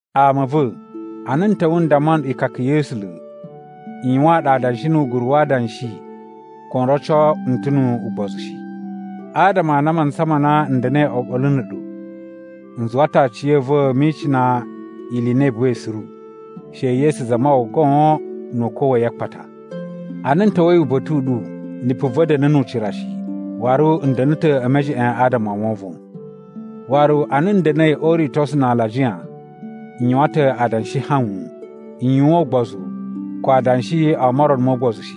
Ama a̱ va̱, ana n ta̱wa̱ n damma nɗu ikaka ya̱ A̱sula̱, n yuwaan ɗu adanshi nu uguru wa adanshi ko n roco n ta̱ nu ugbozu shi. Adama a na a mantsa ma na n da̱na̱i oɓolo na̱ a̱ɗu, n zuwa ta̱ aciya̱va̱ mi icina ili i na i buwai suru, she Yesu Zamawawa goon nu ukwa̱ wa̱ yi a akpata. Ana n ta̱wa̱i uba̱ta̱ u ɗu, lipu va̱ da̱na̱ nu ucira shi, waru n da̱na̱ ta̱ e mejeꞌen adama o wovon. Waru ana n da̱na̱i o uritosu na alajiya n yuwan ta̱ adanshi hawun. N yuwan ugbozu ko adanshi o morono mo ugbozu shi.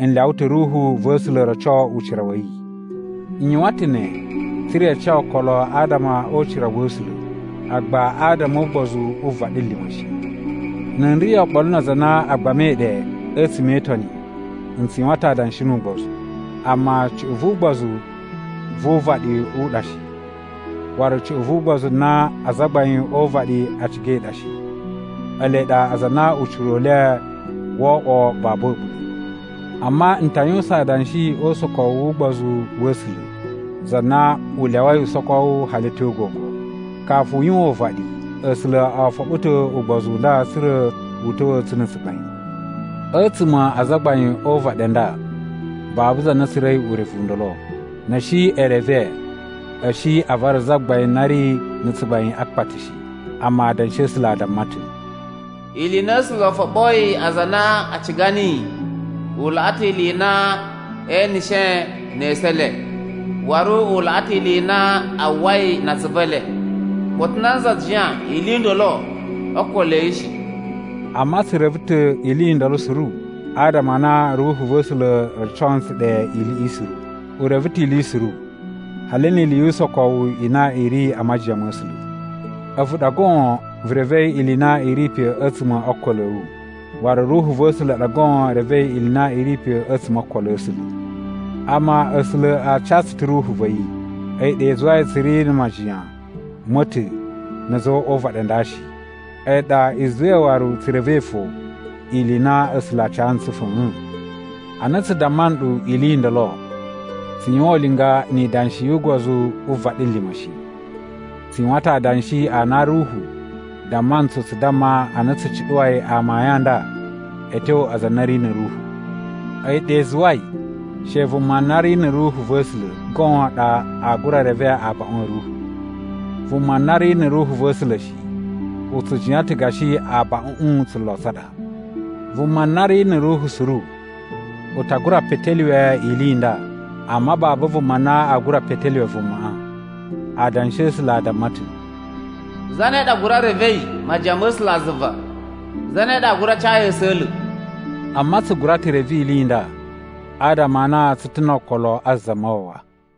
N lyawa ta̱ Ruhu va̱ A̱sula̱ roco ucira wa̱ yi. N yuwan ta̱ ne tsa̱ra̱ i ca okolo adama o ucira wa̱ A̱sula̱, agba adama o ugbozu wu vaɗilima̱ shi. Na̱ n ri oɓolo na aza a na a gbamai ɗe a̱tsuma̱ e Itoni, n tsu yuwan ta̱ adanshi nu ugbozu. Amma cuꞌun vu ugbozu vu uvaɗi u ɗa shi, waru cuꞌun vu ugbozu na azagbain o uvaɗi a cigai ɗa shi. Ele ɗa aza a na ucira u le woo oꞌwo babu a̱ɓula̱. Amma n ta yuwusan adanshi o usokowu wu ugbozu wa̱ A̱sula̱, za na u lyawai usokowu hali a̱ tyo gogo. Kafu u yuwan uvaɗi, A̱sula̱ o foɓo ta̱ ugbozu u nda tsa̱ra̱ u ta̱wa̱a̱ tsu na̱ tsugbain. A̱tsuma̱ a azagbain o uvaɗi a nda babu za na tsura̱i urevu u ndolo. Na̱ a̱ shi e reve, a̱ shi a vara Zagbain na ri na̱ tsugbain a akpata shi. Amma Adanshi a̱ A̱sula̱ a damma ta̱: “Ili i na A̱sula̱ o foɓoyi aza a na a ciga niyi u laꞌa ta̱ ili i na ee eneshe ne esu e le, waru u laꞌa ta̱ ili i na a uwwai na atsuvu e le. Koto nanza jiyan ili i ndolo o okolo a̱ yi shi!” Amma tsu reve ta̱ ili i ndolo suru adama a na Ruhu va̱ A̱sula̱ roco ntsu ɗe iliꞌi suru. U reve ta̱ ili suru, hali ni ili yu usokowu i na i ri a majiyan ma̱ A̱sula̱. A̱vu ɗa goon vu revei ili i na i ri pe a̱tsuma̱ o okolo a̱ wu, waru Ruhu va̱ A̱sula̱ ɗa goon revei ili i na i ri pe a̱tsuma̱ o okolo a̱ A̱sula̱. Amma A̱sula̱ a ca tsu ta̱ Ruhu va̱ yi. A̱yi ɗa i zuwai tsu ri na̱ majiyan ma̱ ta̱ na̱ a̱za̱ o uvaɗi a nda shi. A̱yi ɗa i zuwai waru tsu revei fo ili i na A̱sula̱ a ca ntsu fa̱a̱n. Ana tsu damma nɗu ili i ndolo, tsu yuwan ulinga ni idanshi yu ugbozu wu vaɗilima̱ shi. Tsu yuwan ta̱ adanshi a na Ruhu damma ntsu tsu damma ana tsu cuɗuwai amayun a nda a̱ tyo aza a na a̱ ri na̱ Ruhu. A̱yi ɗa i zuwai she vuma na ri na̱ Ruhu va̱ A̱sula̱ goon ɗa aa gura reve abaꞌun a̱ Ruhu. Vuma na ri na̱ Ruhu va̱ A̱sula̱ shi, u tsu jiyan ta̱ gashi abaꞌuꞌun tsulo tsa ɗa. Vuma na ri na̱ Ruhu suru u ta gura petelyuwe ili i nda, amma babu vuma na aa gura petelyuwe vumaꞌa. Adanshi a̱ A̱sula̱ a damma ta̱: “Zane ɗa gura revei majiyan ma̱ A̱sulazuva? Zane ɗa aa gura ca yi a̱sa̱la̱?” Amma tsu gura ta̱ reve ili i nda, adama a na tsu ta̱ no okolo a Zamawawa.